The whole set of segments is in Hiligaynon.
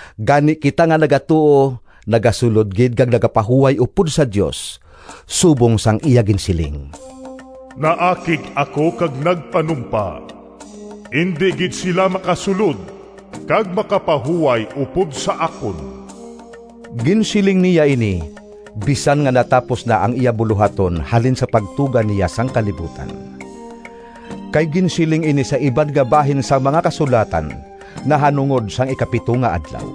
Gani kita nga nagatuo nagasulod gid kag nagapahuway upod sa Dios, subong sang iya ginsiling: “Naakig ako kag nagpanumpa: ‘Indi gid sila Makasulod kag makapahuway Upod sa akon!’” Ginsiling niya ini bisan nga natapos na ang iya bulohaton halin sang pagtuga niya sang kalibutan. Kay ginsiling ini sa iban nga bahin sang mga Kasulatan nahanungod sang ikapito nga adlaw,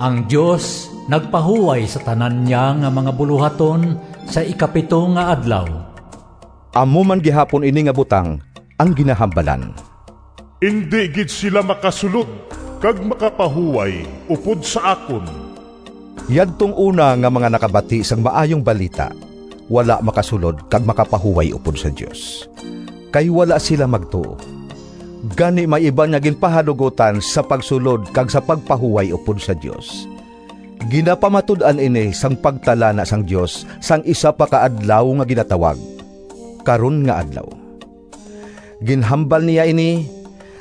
“Ang Dios nagpahuway sa tanan niya nga mga bulohaton sa ikapito nga adlaw.” Amo man gihapon ini nga butang ang ginahambalan, “Indi gid sila makasulod kag makapahuway upod sa akon.” Yadtong una nga mga nakabati sang Maayong Balita wala makasulod kag makapahuway upod sa Dios, kay wala sila magtuo. Gani may iban nga ginpahanugotan sa pagsulod kag sa pagpahuway upod sa Dios. Ginapamatud-an ini sang pagtalana sang Dios sang isa pa ka adlaw nga ginatawag “Karon nga Adlaw.” Ginhambal niya ini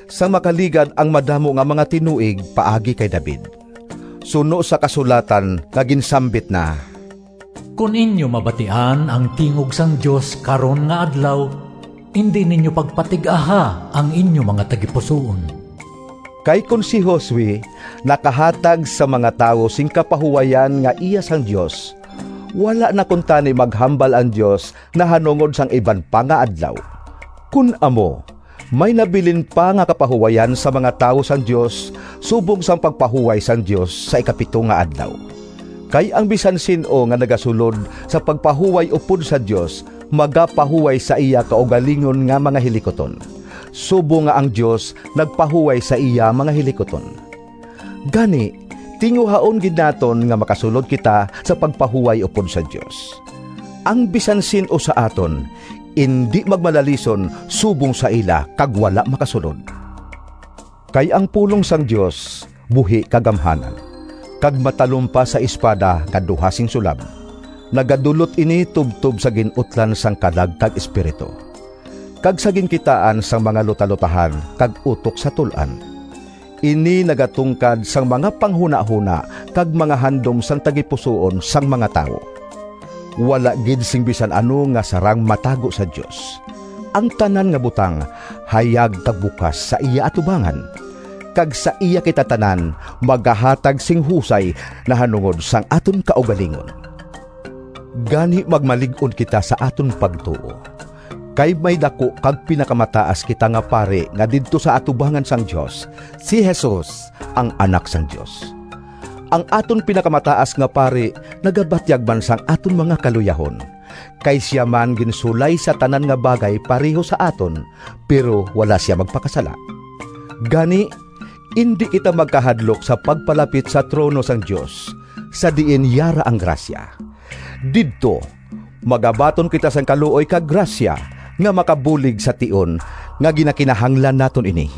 sang makaligad ang madamo nga mga tinuig paagi kay David, suno sa kasulatan nga ginsambit na: “Kon inyo mabatian Ang tingog sang Dios karon nga adlaw, Indi ninyo pagpatig-aha Ang inyo mga tagipusoon.” Kay kon si Josue nakahatag sa mga tawo sing kapahuwayan nga iya sang Dios, wala na kuntani maghambal ang Dios nahanungod sang iban pa nga adlaw. Kon amo, may nabilin pa nga kapahuwayan sa mga tawo sang Dios subong sang pagpahuway sang Dios sa ikapito nga adlaw. Kay ang bisan sin-o nga nagasulod sa pagpahuway upod sa Dios, magapahuway sa iya kaugalingon nga mga hilikuton, subong nga ang Dios nagpahuway sa iya mga hilikuton. Gani tinguhaon gid naton nga makasulod kita sa pagpahuway upod sa Dios. Ang bisan sin-o sa aton indi magmalalison subong sa ila kag wala makasulod. Kay ang pulong sang Dios buhi kag gamhanan, kag matalom pa sa espada nga duha sing sulab. Nagadulot ini tubtob sa gin-utlan sang kalag kag espiritu, kag sa ginkitaan sang mga lutalotahan kag utok sa tul-an. Ini nagatungkad sang mga panghunahona kag mga handom sang tagipusoon sang mga tawo. Wala gid sing bisan ano nga sarang matago sa Dios. Ang tanan nga butang hayag kag bukas sa iya atubangan, kag sa iya kita tanan magahatag sing husay nahanungod sang aton kaugalingon. Gani magmalig-on kita sa aton pagtuo. Kay may daku kag pinakamataas kita nga pari nga didto sa atubangan sang Dios—si Jesus, ang Anak sang Dios. Ang aton pinakamataas nga pari nagabatyag man sang aton mga kaluyahon, kay sia man ginsulay sa tanan nga bagay pareho sa aton, pero wala sia magpakasala. Gani indi kita magkahadlok sa pagpalapit sa trono sang Dios, sa diin yara ang grasya. Didto magabaton kita sing kaluoy kag grasya nga makabulig sa tion nga ginakinahanglan naton ini.